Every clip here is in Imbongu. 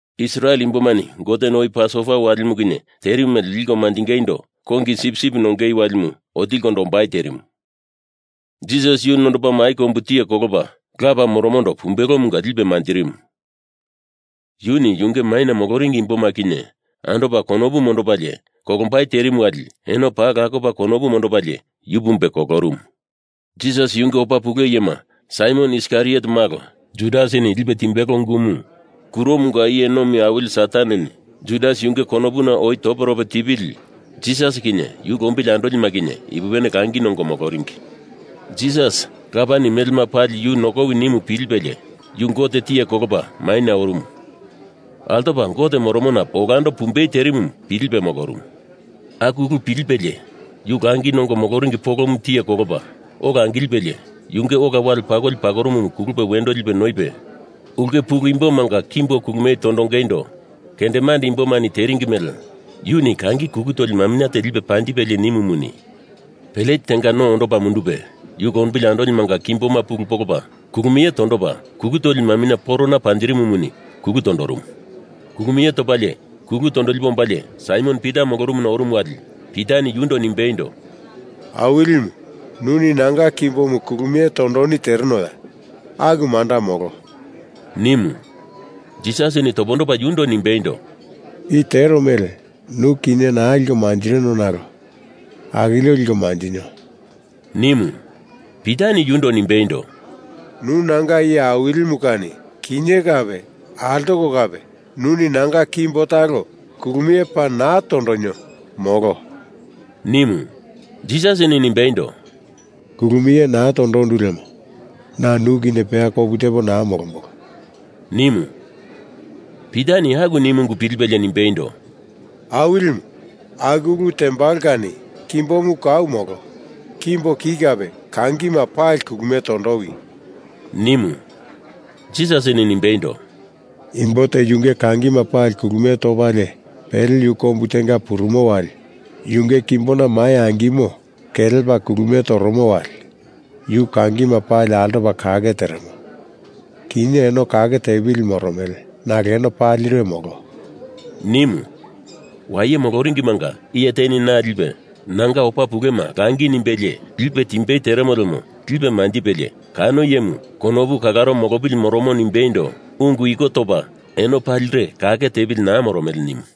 Israel imbomani Goteni oi Pasova walimu kinye terimu mele liko manjingeindo kongi sipsip nongei walimu otilikondo ombai terimu. Jisas yu nondopa mai kombu tiye kolopa Lapa moromondo pumbelomunga lipe manjirimu. Yuni yunge maina moloringi imboma kinye andopa konopu mondopalie kolombai terimu wali eno paa lakopa konopu mondopalie yu pumbe kolorumu. Jisas yunge opa pule iyema Saimon Iskariot malo Judasini lipe timbelo ungumu kuromanga iye nomi awili Sataneni Judas yunge konopuna oi toperope tipili, Jisas kinye yu lombili andolima kinye ipupene langi nongo moloringi. Jisas, Lapani melema pali yu nokowi nimu pilipelie, yu Gote tiye kolopa mainye orumu altopa Gote moromona olando pumbei terimu, pilipe molorumu. Aku ulu pilipelie, yu langi nongo moloringi polomu tiye kolopa ola angilipelie yunge ola wale pakoli pakorumumu kulupe wendo lipe noipe, ulke pulu imbomanga kimbo kulumie tondongeindo kendemande imbomani teringi mele yuni kangi kulu toli maminye te lipe panjipelie nimumuni, plet tenga no ondopa mundupe yu lombili andolimanga kimboma pulu polopa kulumie tondopa kulu toli maminye porona panjirimumuni kulu tondorumu. Kulumie topalie kulu tondolipe ombalie Saimon Pita molorumuna orumu wali Pitani yundo nimbeindo, “Awilimu, nuni nanga kimbomu kulumie tondoni terenoya? Aku manda molo,” nimu. Jisasini topondopa yundo nimbeindo, “I tero mele nu kinye naa liko manjirino nalo akilio liko manjinio,” nimu. Pitani yundo nimbeindo, “Nu nanga iye Awilimu kani kinye kape altoko kape nuni nanga kimbo talo kulumie paa naa tondonio, molo,” nimu. Jisasini nimbeindo, “Kulumie naa tondondu lemo na nu kinye peya kopu tepo naa molombolo,” nimu. Pitani aku nimu ungu pilipelie nimbeindo, “Awilimu, aku ulu tembalo kani kimbomu kau molo! Kimbo ki kape kangima pali kulumie tondowi!” nimu. Jisasini nimbeindo, “Imbo te yunge kangima pali kulumie topalie pele yu kombu tenga purumo wali yunge kimbona mai angimo kelepa kulumie toromo wali yu kangima pali altopa kake teremo. Kinye eno kake tepili moromele, nalo eno palire molo,” nimu. Waye moloringimanga iye teni na lipe nanga opa pulema langi nimbelie lipe timbei teremo lemo lipe manjipelie kano iyemu konopu kalaro molopili moromo nimbeindo ungu iko topa eno palire kake tepili naa moromele nimu.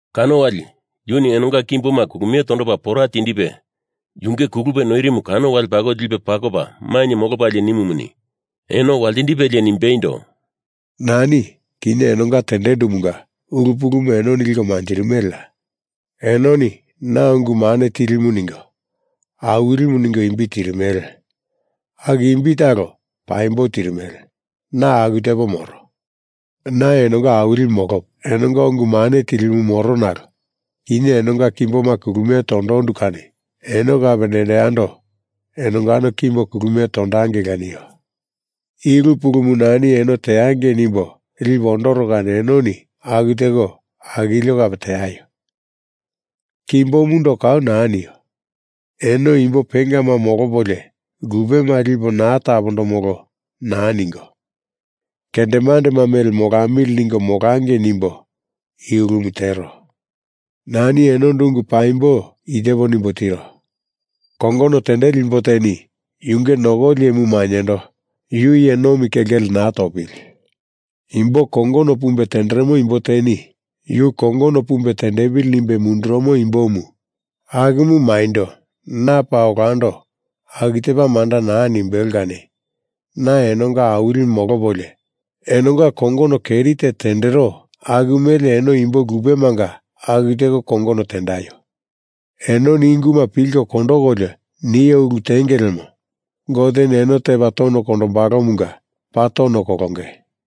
Kano wali yuni enonga kimboma kulumie topa pora tindipe, yunge kulupe noirimu kano wale pakoli lipe pakopa mainye molopalie nimumuni, eno waltindipelie nimbeindo, “Nani, kinye enonga tendendumunga ulu pulumu enoni liko manjirimeleya? Enoni na Ungu Mane Tilimu ningo, Awilimu ningo imbi tirimele. Aku imbi talo paimbo tirimele, na aku tepo moro. Na enonga Awilimu molopo enonga Ungu Mane Tilimu moro nalo kinye enonga kimboma kulumie tondondu kani eno kape nendo yando enongano kimbo kulumie tondangeila nio. I ulu pulumu nani eno teangei nimbo lipo ondoro kani enoni aku teko akilio kape teaio! Kimbomundo kau naa nio. Eno imbo pengama molopolio lupema lipo naa tapondomolo naa ningo, kendemandema mele molamili ningo molangei nimbo i ulumu tero. Nani enondo ungu paimbo i tepo nimbo tiro. Kongono tendeli imbo teni yunge nokoli iyemu maindo yu iye nomi kelkele naa topili. Imbo kongono pumbe tenderemo imbo teni yu kongono pumbe tendepili nimbe mundurumo imbomu akumu maindo na paa olando aku tepa manda naa nimbelo kani na enonga Awilimu molopolio enonga kongono keri te tendero aku mele eno imbo lupemanga aku teko kongono tendaio! Enoni i unguma pilko kondokolio nio ulu tenge lemo Goteni eno tepa tono kondombalomunga paa tono kolonge.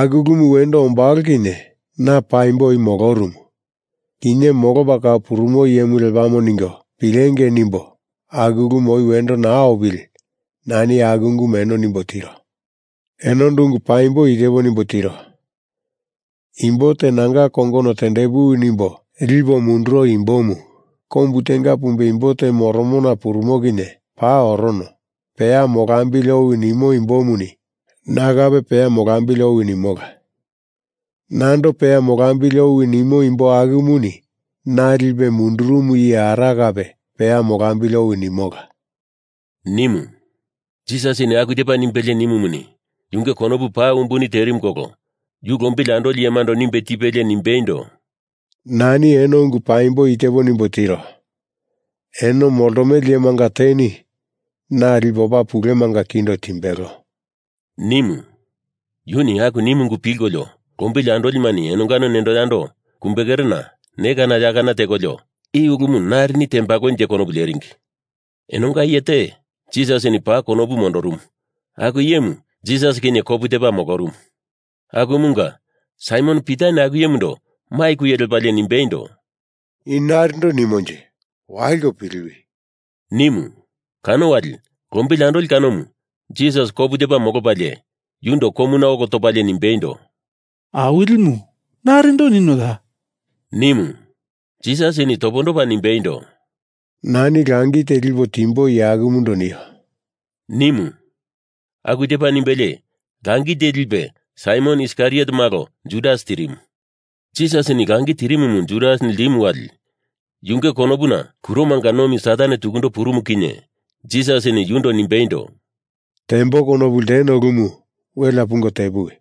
Aku ulumu wendo ombalo kinye na paimbo oi molorumu, kinye molopa kau purumo iyemu lepamo ningo pilengei nimbo aku ulumu oi wendo naa opili nani aku ungumu eno nimbo tiro. Enondo ungu paimbo i tepo nimbo tiro. Imbo te nanga kongono tendepuwi nimbo lipo munduro imbomu kombu tenga pumbe imbo te moromona purumo kinye paa orono, peya molambili owi nimo imbomuni na kape peya molambili owi nimola. Nando peya molambili owi nimo imbo akumuni na lipe mundurumu iye Ara kape peya molambili owi nimola,” nimu. Jisasini aku tepa nimbelie nimumuni, yunge konopu paa umbuni terimu kolo yu lombili andoli iyemando nimbe tipelie nimbeindo, “Nani eno ungu paimbo i tepo nimbo tiro. Eno moltomele iyemanga teni na lipe opa pulemanga kindo timbelo,” nimu. Yuni aku nimu ungu pilkolio lombili andolima enongano nendo yando kumbekerena ne kana ya kana tekolio i ulumu narini tembalonje konopu leringi. Enonga iye te, Jisasini paa konopu mondorumu aku iyemu Jisas kinye kopu tepa molorumu. Akumunga Saimon Pitani aku iyemundo mai kuye lepalie nimbeindo, “I narindo nimonje? Waliko piliwi!” nimu. Kano wali lombili andoli kanomu Jisas kopu tepa molopalie yundo komuna olo topalie nimbeindo, “Awilimu, narindo ninoya?” nimu. Jisasini topondopa nimbeindo, “Nani langi te lipo timbo iye akumundo nio,” nimu. Aku tepa nimbelie langi te lipe Saimon Iskariot malo Judas tirimu. Jisasini langi tirimumu Judas ltimu wali yunge konopuna kuromanga nomi Satan tukundo purumu kinye Jisasini yundo nimbeindo, “Tembo konopu lteno ulumu welea pungo tepuwi!”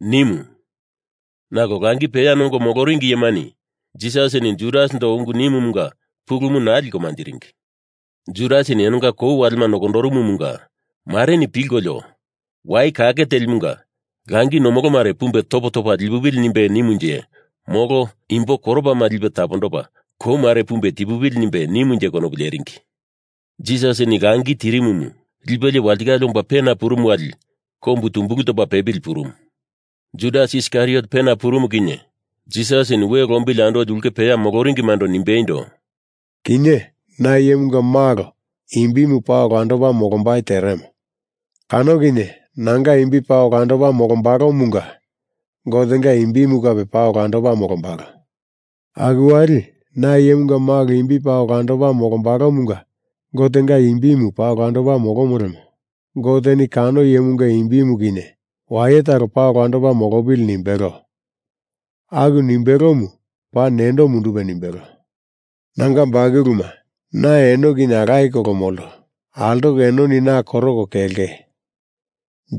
nimu, nalo langi peya nongo moloringi iyema Jisasini Judasindo ungu nimumunga pulumu naa liko manjiringi. Judasini enonga kou walemu nokondoromomunga mareni pilkolio Wai Kake Telimanga langi nomolo mare pumbe topo topa lipupili nimbe nimunje molo imbo koropama lipe tapondopa kou mare pumbe tipupili nimbe nimunje konopu leringi. Judas langi tirimumu lipelie walitikale omba pena purumu wali kombu tumbulu topa pepili purumu. Judas Iskariot pena purumu kinye Jisasini we lombili andoli ulkena peya moloringimando nimbeindo, “Kinye na Iyemunga Malo imbimu paa olandopa molombai teremo. Kano kinye nanga imbi paa olandopa molombalomunga Gotenga imbimu kape paa olandopa molombalo. Aku wali na Iyemunga Malo imbi paa olandopa molombalomunga Gotenga imbimu paa olandopa molomo lemo Goteni kano iyemunga imbimu kinye waye talo paa olandopa molopili nimbelo. Aku nimbelomu paa nendo mundupe nimbelo. Nanga bakuluma, na eno kinye alaye kolo molto. Altoko enoni na koroko kelenge.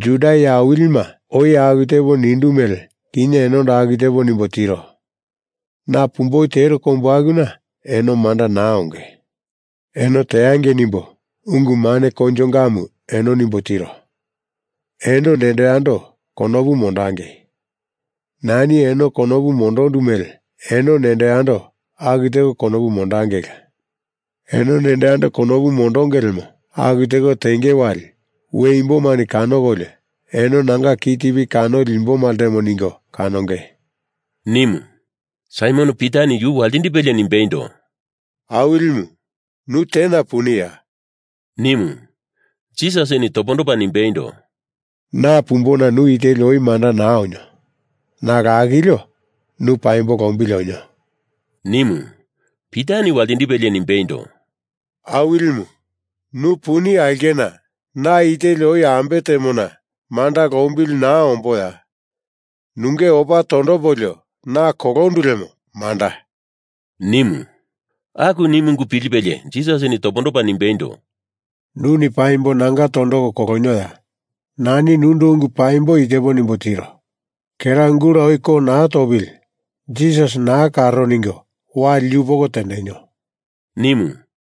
Juda iye awilima oi aku tepo nindu mele kinye enondo aku tepo nimbo tiro. Na pumboi tero kombu akuna eno manda naa onge. Eno teangei nimbo ungu mane koinjongamu eno nimbo tiro. Eno nendo yando konopu mondangei! Nani eno konopu mondondu mele eno nendo yando aku teko konopu mondangeila! Eno nendo yando konopu mondonge lemo aku teko tenge wali we imbomani kanokolio eno nanga ki tipi kanoli imboma ltemo ningo kanonge,” nimu. Saimon Pitani yu waltindipelie nimbeindo, “Awilimu, nu tena puniya?” nimu. Jisasini topondopa nimbeindo, “Na pumbona nu i teli oi manda naa onio. Nalo akilio nu paimbo lombili onio,” nimu. Pitani waltindipelie nimbeindo, “Awilimu, nu puni aulkena na i teli oi ambe temona manda lombili naa omboya? Nunge opa tondopolio na kolondu lemo manda,” nimu. Aku nimu ungu pilipelie Jisasini topondopa nimbeindo, “Nuni paimbo nanga tondoko kolonioya? Nani nundo ungu paimbo i tepo nimbo tiro. Kera gula oi ko naa topili Jisas naa karo ningo wali yupoko tendenio,” nimu.